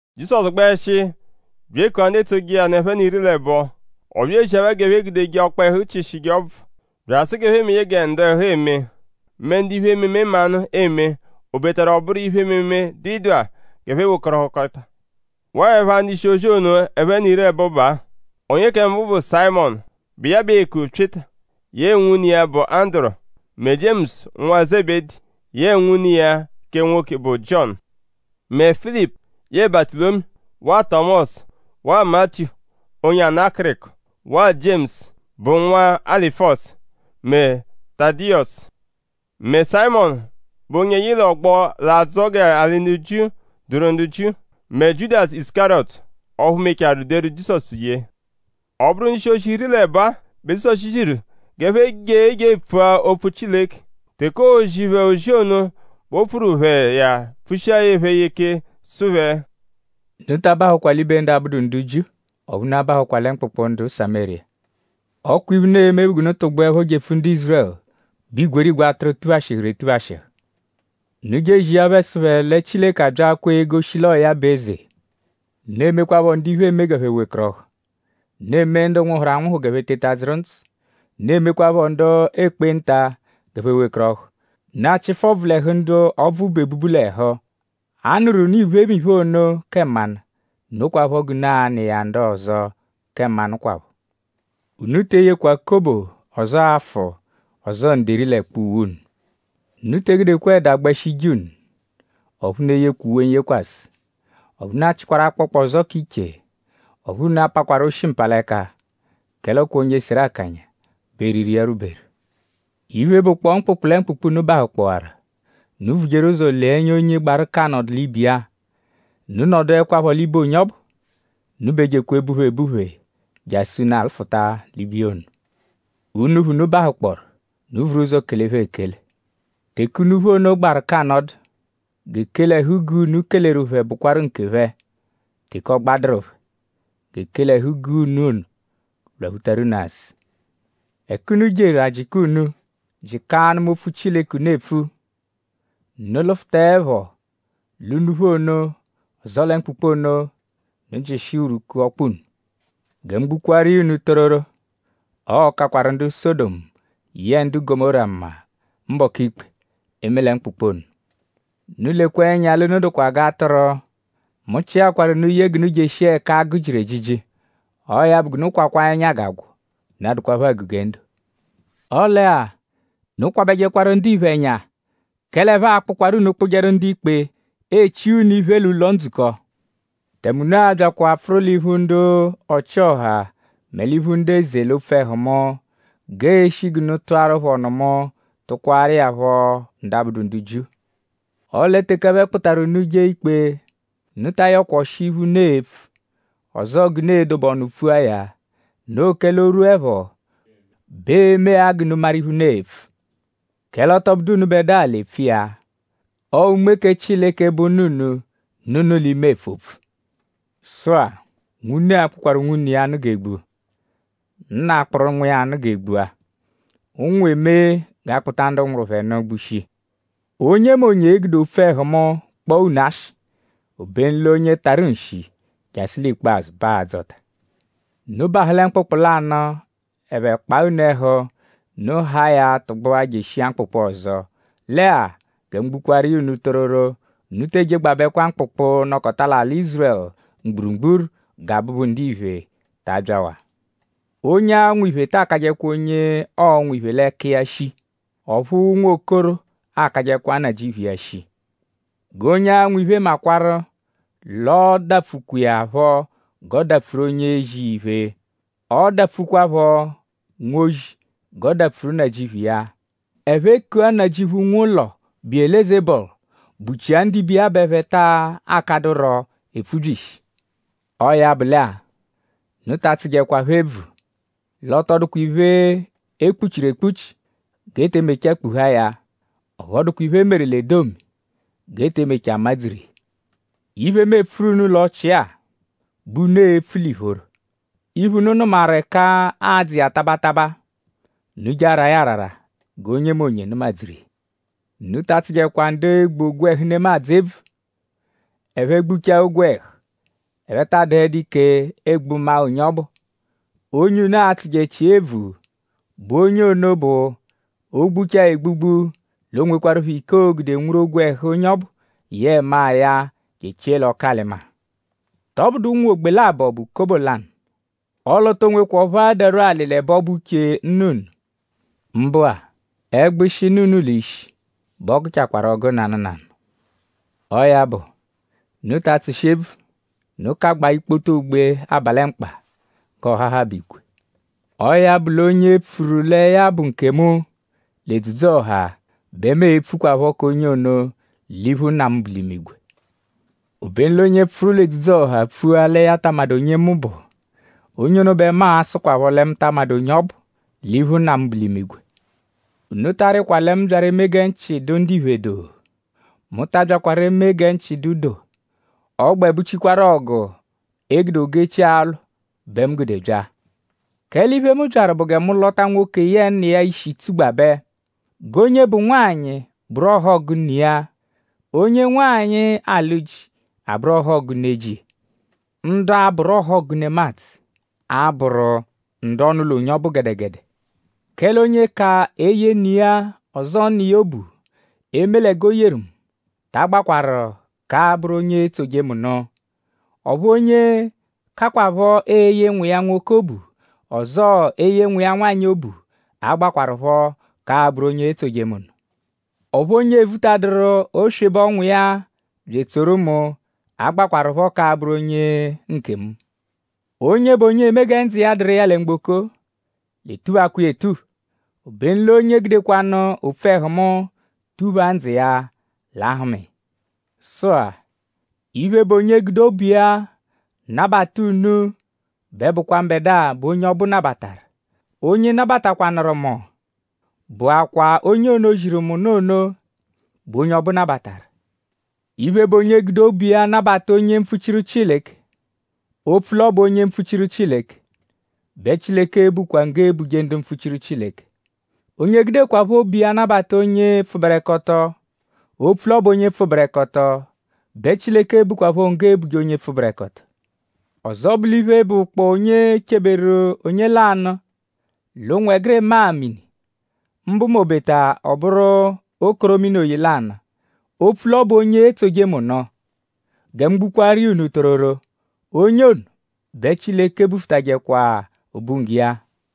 Jizọsu gbẹshi bya ekua ndu etsoje iya nụ ẹphe n'iri l'ẹbo. Ọ bya ezia phẹ g'ẹphe gude ọkpehu chịshije ọbvu. Bya asụ g'ẹphe meje gẹ ndu ẹhu eme mẹ ndu iphe-ememe mmanụ eme; obetaru ọ bụru iphe-ememe, dụ ịdagha; g'ẹphe wekọrohukotachaa. Waa ẹpha ndu-ishi-ozi ono ẹphe n'iri l'ẹbo baa: onye kẹ mbụ bụ Sayịmonu, bụ iya bẹ eeku Pyịta; yẹe nwune iya, bụ Anduru; mẹ Jiemusu nwa Zebedi; yẹe nwune iya kẹ nwoke, bụ Jiọnu; mẹ Filipu; yẹe Batụlomiyu; waa Tọmosu; waa Matiyu, onye ana akịriko; waa Jiemusu, bụ nwa Alufiyọsu; mẹ Tadiyọsu; mẹ Sayịmonu, bụ onye yị l'ọgbo, l'adzọ g'alị Jiu dụru ndu Jiu; mẹ Jiudasu Isukariyọtu; ọphu mechaarụ deru Jizọsu ye. Ọ bụru ndu-ishi-ozi iri l'ẹbo-a bẹ Jizọsu ziru g'ẹphe je je epfua opfu Chileke. Teke oozi phẹ ozi ono bẹ o pfuru phẹ iya pfushiaru phẹ iya ike sụ phẹ: “Unu ta abahụkwa l'ibe ndu abụdu ndu Jiu; ọphu unu abahụkwa mkpụkpu ndu Samériya. Ọ kwa iphe, unu e-me bụ g'unu tụgbuepho jepfu ndu Ízurẹlu, bụ igwerigwe atụru, tuphashịhuru etuphashịhu. Unu je ezia phẹ sụ phẹ lẹ Chileke abyaakwaa egoshi l'ọo ya bụ eze. Unu emekwaaphọ ndu iphe eme g'ẹphe wekọrohu. Unu emee ndu nwụhuru anwụhu g'ẹphe teta dzụru ndzụ. Unu emekwaaphọ ndu ekpenta g'ẹphe wekọrohu; unu achịfu ọbvu l'ẹhu ndu ọbvu bu ebubu l'ẹhu. A nụru unu iphemiphe ono kẹ mmanụ. Nokwaphọ g'unu a-nụ iya ndu ọzo kẹ mmanụ kwaphọ. Unu te eyekwa kobo; ọzoo afụ; ọzoo nderi l'ẹkpa uwe unu. Unu te egudekwa ẹda gbẹshi ije unu. Ọphu unu eyekwa uwe n-yekwasẹ. Ọphu unu achịkwaru akpọkpa ọzo k'iche. Ọphu unu apakwaru oshi-mpalẹka. Kẹle ọ kwa onye seru akanya bẹ eriri iya rwuberu. “Iphe, bụkpoo mkpụkpu lẹ mkpụkpu, unu bahụkpowaru; unu vujeru ụzo lee ẹnya onye gbaru g'a nọdu l'ibe iya. Unu nọduekwapho l'ibe onye ọbu. Unu b'ejekwa ebuphe ebuphe jasụ unu afụta l'ibiya ono. Unuphu, unu bahụkpooru; unu vuru ụzo kele phẹ ekele. Teke unuphu ono gbaru k'anọdu; g'ekele ẹhu-guu, unu keleru phẹ bụkwaru nkephẹ. Teke ọ gbadụru phẹ; g'ekele ẹhu-guu, unu ono lwaphutaru unu azụ. Ẹka unu jeru; a jịka unu; jịka anụma opfu Chileke, unu epfu; unu -lụfutaepho l'unuphu ono; ọzoo lẹ mkpụkpu ono; unu jịshia urwuku ọkpa unu. Gẹ mu gbukwaaru iya unu tororo; ọo-kakwaru ndu Sọdomu yẹe ndu Gọmóra mma mbọku ikpe; eme lẹ mkpụkpu ono.” “Unu lekwa ẹnya l'unu dụkwa g'atụru. Mu chịakwaru unu ye g'unu jeshia ẹka agụ jiru ejiji. Ọo ya bụ g'unu kwakwaa ẹnya g'agwọ; unu adụkwapho àgù gẹ ndo. Ọle-a; unu kwabẹjekwaru ndiphe ẹnya. Kẹle ẹphe a-kpụkwaru unu kpụjeru ndu-ikpe; eechia unu iphe l'ụlo-ndzukọ; tẹme unu a-byakwa apfụru l'iphu ndu ọchi-ọha mẹ l'iphu ndu eze l'opfu ẹhu mu; g'ee-shi g'unu tụaru phẹ ọnu mu; tụkwaaru iya phọ ndu abụdu ndu Jiu. Ọle teke ẹphe kpụtaru unu jee ikpe; unu ta ayọkwa ọshi iphe, unu e-pfu; ọzoo g'unu e-dobe ọnu pfua ya. Noo kẹle o -rwuẹpho bẹ ee-me-a g'unu maru iphe, unu e-pfu. Kẹle ọ tọ bụdu unubẹdua l'epfu iya; ọo Unme kẹ Chileke, bụ Nna unu; nọ unu l'ime epfu opfu. “Sụ-a; nwune a-kpụkwaru nwune iya nụ g'e gbua; nna akpụru nwa iya nụ g'e gbua. Ụnwu e-me g'a kpụta ndu nwụru phẹ nụ gbushia. Onyemonye e-gude opfu ẹhu mu kpọo unu ashị; obenu l'onye tarụ nshi jasụ l'ikpazụ bẹ a-dzọta. Unu -bahụ lẹ mkpụkpu lanụ; ẹphe -kpaa unu ẹhu; unu haa ya tụgbua jeshia mkpụkpu ọzo. Lẹ-a; gẹ mu gbukwaaru iya unu tororo; unu tee jegbabẹkwa mkpụkpu, nọkota l'alị Ízurẹlu mgburugburu gẹ Abụbu-Ndiphe ta abyawaa. “Onye anwụ iphe ta akajẹkwa onye ọonwu iphe l'ẹka iya shii; ọphu nwokoro akajẹkwa nnajịuphu iya shii. G'onye anwụ iphe makwarụ l'ọo-dapfukwa iya phọ g'ọ dapfuru onye ezi iya iphe; ọ dapfukwaphọ nwozi g'ọ dapfuru nnajịuphu iya. Ẹphe -kua nnajịuphu, nwe ụlo Biyelezebọlu;?bụchia ndibe iya bẹ ẹphe taa kadụro epfubyishi.” “Ọo ya bụ lẹ-a; unu ta atsụjekwa phẹ ebvu. L'ọ tọ dụkwa iphe, e kpuchiru ekpuchi g'e te mechaa kpuhaa ya; ọphu ọ dụkwa iphe, e meru l'edomi g'e te mechaa madzuru iya. Iphe, mu epfuru unu l'ọchii-a bẹ unu e-pfu l'ìphóró; iphe, unu nụmaru ẹka aadzụ iya taba taba; unu je araa ya arara g'onyemonye nụma-dzuru iya. Unu ta atsụjekwa ndu egbu ogwẹhu nemadzụ ebvu; ẹphe -gbuchaa ogwẹhu; ẹphe taa dụhedu ike egbu maa onye ọbu. Onye unu a-tsụjechia ebvu bụ onye ono bụ: o -gbuchaa egbugbu l'o nwekwarụpho ike, oo-gude nwuru ogwẹhu onye ọbu yẹe maa ya je echie l'ọku-alị-maa. ?Tọbudu ụnwu ogbe labọ bẹ bụ kobo lanụ? Ọle o to nwekwa ọphu adarwu alị l'ẹbe ọ bụ uche Nna unu. Mbụ-a; ẹgbushi, nọ unu l'ishi bẹ ọ gụchaakwaru ọgu nanụ nanụ. Ọo ya bụ; unu ta atsụshi ebvu! Unu kagbaa ikpoto ogbe aba lẹ mkpa; g'ọ hahabẹ igwe.” “Ọo ya bụ l'onye pfuru lẹ ya bụ nkemu l'edzudzu-ọha bẹ mu e-pfukwaphọ k'onye ono l'iphu Nna mu, bu l'imigwe. Obenu l'onye pfụru l'edzudzu-ọha pfua lẹ ya ta amadụ onye mu bụ; onye ono bẹ mu a-sụkwapho lẹ mu ta amadụ onye ọ bụ l'iphu Nna mu, bu l'imigwe.” “Unu ta arịkwa lẹ mu byaru eme gẹ nchị dụ ndiphe doo. Mu ta abyakwaru eme gẹ nchị dụ doo. Ọ gbẹ bụchikwaru ọgu, e gude ogu-echi alwụ bẹ mu gude bya. Kẹle iphe, mu byaru bụ gẹ mu lọta nwoke yẹe nna iya ishi tsugbabẹ. G'onye bụ nwanyị bụru ọhogu ne iya; onye nwanyị, alụ ji abụru ọhogu ne ji iya. Ndu a-bụru ọhogu nemadzụ a-bụru ndu ọnu-ụlo onye ọbu gẹdegede. “Kẹle onye ka eye ne iya ọzoo nna iya obu; eme lẹ g'o yeru mu; ta agbakwarụ k'abụru onye etsoje mu nụ. Ọphu onye kakwaphọ eye nwa iya nwoke obu; ọzoo eye nwa iya nwanyị obu; agbakwarụpho k'abụru onye etsoje mu nụ. Ọphu onye evutaduru oswebe ọnwu iya bya etsoru mu agbakwarụpho k'abụru onye nkemu. Onye bụ onye eme gẹ ndzụ iya dụru iya lẹ mgboko-a l'etuphakwa iya etupha. Obenu l'onye gudekwanụ opfu ẹhu mu tuphaa ndzụ iya l'a-hụma iya.” “Sụ-a; iphe, bụ onye gude obu iya nabata unu bẹ bụkwa mbẹdua bẹ onye ọbu nabataru. Onye nabatakwanụru mu bụakwaa onye ono, ziru mu ozi ono bẹ onye ọbu nabataru. Iphe, bụ onye gude obu iya nabata onye mpfuchiru Chileke; opfu l'ọ bụ onye mpfuchiru Chileke bẹ Chileke e-bukwa nggo, eebuje ndu mpfuchiru Chileke. Onye gudekwaphọ obu iya nabata onye pfụberekoto; opfu l'ọ bụ onye pfụberekoto bẹ Chileke e-bukwaphọ nggo, eebuje onye pfụberekoto. Ọzo bụ l'iphe, bụkpoo onye cheberu onye lanụ l'ụnwegirima-a mini; mbụ m'obeta ọ bụru okoro mini-oyi lanụ; opfu l'ọ bụ onye etsoje mu nụ; gẹ mu gbukwaaru iya unu tororo; onye ono bẹ Chileke bufutajẹkwa obunggo iya.”